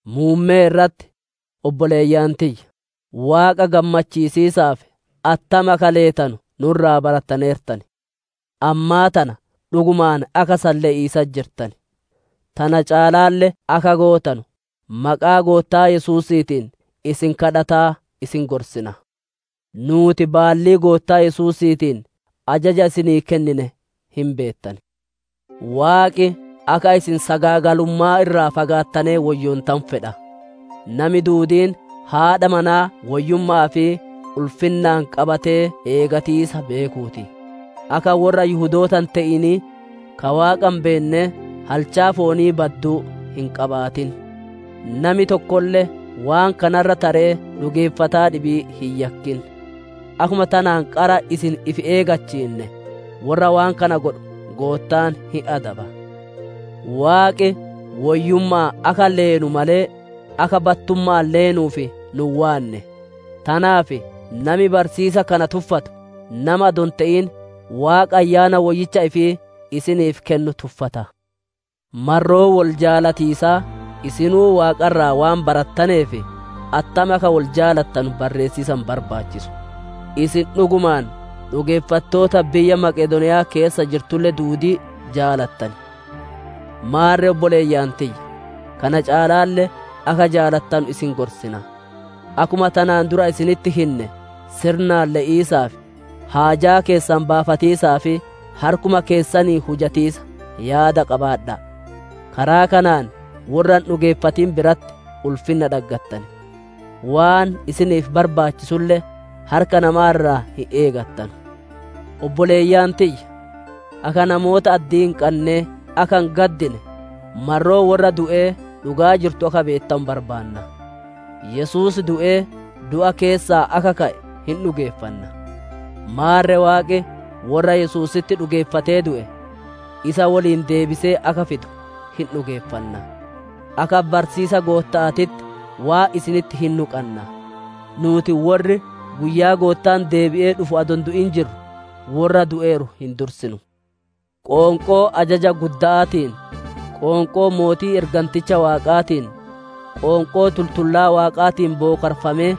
Muummee irratti, obboleeyyan tiyya, Waaqa gammachiisiisaaf attam akka leetanu nu irraa barattaneertan. Ammaa tana dhugumaan akka san le'iisatti jirtan; tana caalaalle akka gootanu, maqaa Goottaa Yesuusiitiin isin gaafataa isin gorsina. Nuuti baallii Goottaa Yesuusiitiin ajaja isinii kennine hin beettan. Waaqi akka isin sagaagalummaa irraa fagaattanee woyyoontanu fedha. Nami duudiin haadha manaa woyyumma'aa fi ulfinnaan qabatee eegatiisa beekuu ti. Akka worra Yihudoota hin te'inii, ka Waaqa hin beennee halchaa foonii badduu hin qabaatin. Nami tokkolle waan kana irra taree dhugeeffataa dhibii hin yakkin. Akkuma tanaan qara isin ifi eegachiinne, worra waan kana godhu Goottaan hin adaba. Waaqi woyyumma'aan akka leenu malee, akka battumma'aan leenuuf nu hin waanne. Tanaaf, nami barsiisa kana tuffatu, nama adoo hin te'in, Waaqa Ayyaana Woyyicha ifii isiniif kennu tuffata. Marroo wol jaalatiisaa isinuu Waaqa irraa waan barattaneef attam akka wol jaalattanu barreessiisa hin barbaachisu. Isin dhugumaan dhugeeffattoota biyya Maqedooniya'aa keessa jirtulle duudii jaalattan. Maarre obboleeyyan tiyya, kana caalaalle akka jaalattanu isin gorsina. Akkuma tanaan dura isinitti hinne sirnaan le'iisaaf, haajaa keessan baafatiisaa fi harkuma keessaniin hujatiisa yaada qabaadha'a. Karaa kanaan worra hin dhugeeffatin biratti ulfinna dhaggattan; waan isiniif barbaachisulle harka namaa irraa hin eegattanu. Obboleeyyan tiyya! Akka namoota addii hin qannee akka hin gaddine, marroo worra du'ee dhugaa jirtu akka beettanu barbaanna. Yesuus du'ee, du'a keessaa akka ka'e hin dhugeeffanna; maarre Waaqi, worra Yesuusitti dhugeeffatee du'e, isa woliin deebisee akka fidu hin dhugeeffanna. Akka barsiisa Gootta'aatitti waan isinitti hinnu qanna: nuuti worri guyyaa Goottaan deebi'ee dhufu adoo hin du'in jirru, worra du'eeru hin dursinu. Qoonqoo ajaja gudda'aatiin, qoonqoo mootii erganticha Waaqaatiin, qoonqoo tultullaa Waaqaatiin bookarfamee,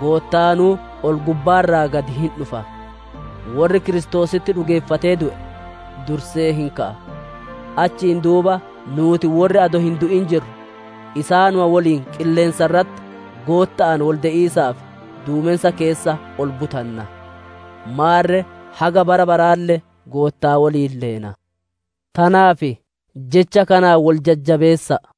Goottaanuu ol-gubbaa irraa gadi hin dhufa. Worri Kiristoositti dhugeeffatee du'e, dursee hin ka'a; achiin duuba nuuti worri adoo hin du'in jirru isaanuma woliin qilleensa irratti Gootta'aan wolde'iisaaf duumensa keessa ol butanna. Maarre haga bara baraalle Goottaa woliin leena. Tanaaf jecha kanaan wol jajjabeessa'a.